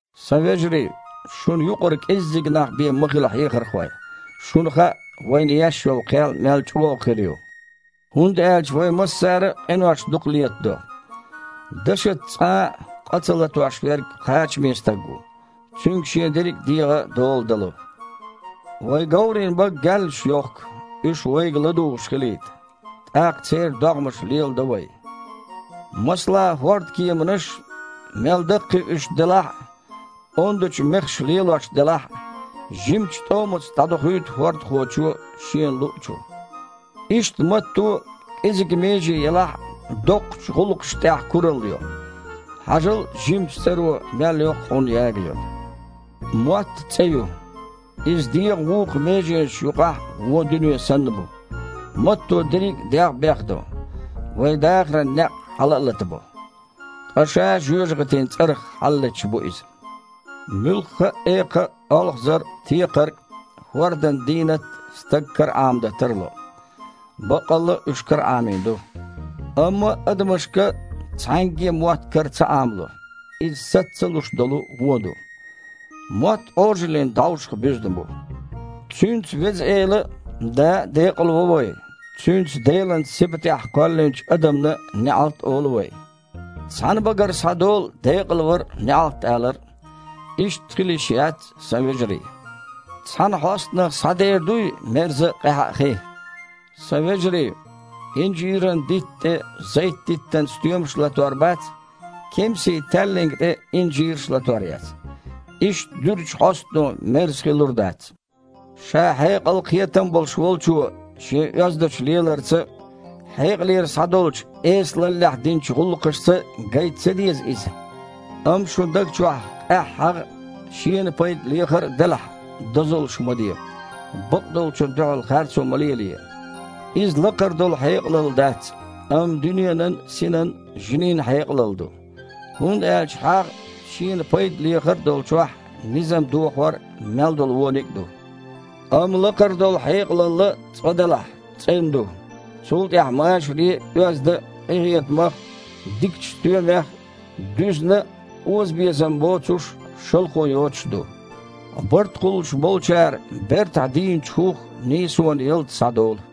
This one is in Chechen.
Сан вежарий! Шуна юкъара кІеззиг нах бен ма хила хьехархой. Шуна хаьа, вайна еш йолу кхел мел чІогІа хир ю, хІунда аьлча вай массара а къинош дукха летадо. Дашаца цкъа а къа ца латош верг кхачаме стаг ву, цуьнга шен дерриг дегІан дола дало. Вай говрийн бага гаьллаш йохку, уьш вайга ладугІуш хилийта, тІаккха церан догІмаш леладо вай. Масала, хІордкеманаш а, мел даккхий уьш делахь а, ондачу мехаша лелош делахь а, жимачу тІомаца дІадохуьйту хІордахочо шена луъучу. Иштта, матто а, кІезиг меже елахь а, доккхачу гІуллакхашна тІехь куралла йо. Хьажал, жимачу цІаро мел йоккха хьун ягайо! Мотт а цІе ю. Иза дегІан вукху меженашна юкъахь вон дуьне санна бу. Матто дерриг дегІ а бехдо, вайн дахаран некъ хьала а латабо. Ткъа ша жоьжахатин цІарах хьалалеташ бу иза. Муьлхха а экха а, олхазар а, текхарг а, хІордан дийнат а стага караІамадан тарло (баккъалла а, уьш караІамийна ду). Амма адамашка цхьаьнгге а мотт кара ца Іамало, иза саца ца луш долу вон ду. Мотт Іожаллин дІовшах буьзна бу. Цуьнца Веза Эла а, Да а декъалво вай, цуьнца Делан сибатехь кхоьллинчу адамна неІалт а олу вай. Цхьана багара схьадолу декъалвар а, неІалт алар а. Иштта хила йиш яц, сан вежарий. Цхьана хьостанах схьадер дуй мерза а, къаьхьа а хи? Сан вежарий, инжиран дитта тІе зайт-диттан стоьмаш а латор бац, кемсийн таьлланга тІе инжираш а латор яц. Иштта дуьрачу хьостано мерза хи лур дац. Ша хьекъал а, кхетам а болуш волчо шен оьздачу леларца а, хьекъалера схьадолчу эсалаллехь динчу гІуллакхашца а гайта ца деза иза? Амма шун даг чохь къаьхьа хьагІ а, шена пайда лехар а делахь, дозаллаш ма де, бакъдолчунна дуьхьал харцо ма лелае. Иза лакхара долу хьекъалалла дац, амма дуьненан, синан, жинийн хьекъалалла ду. ХІунда аьлча хьагІ а, шена пайда лехар а долчохь низам дохор а, мел долу вониг а ду. Амма лакхара долу хьекъалалла, цкъа-делахь, цІена ду, цул тІаьхьа, машаре а, оьзда а, къинхетамах а, дикачу стоьмех а дуьзна а, озабезам боцуш а, шалхо йоцуш а ду. Барт кхуллуш болчара бертахь дийначу хІух нийсонан ялта схьадолу.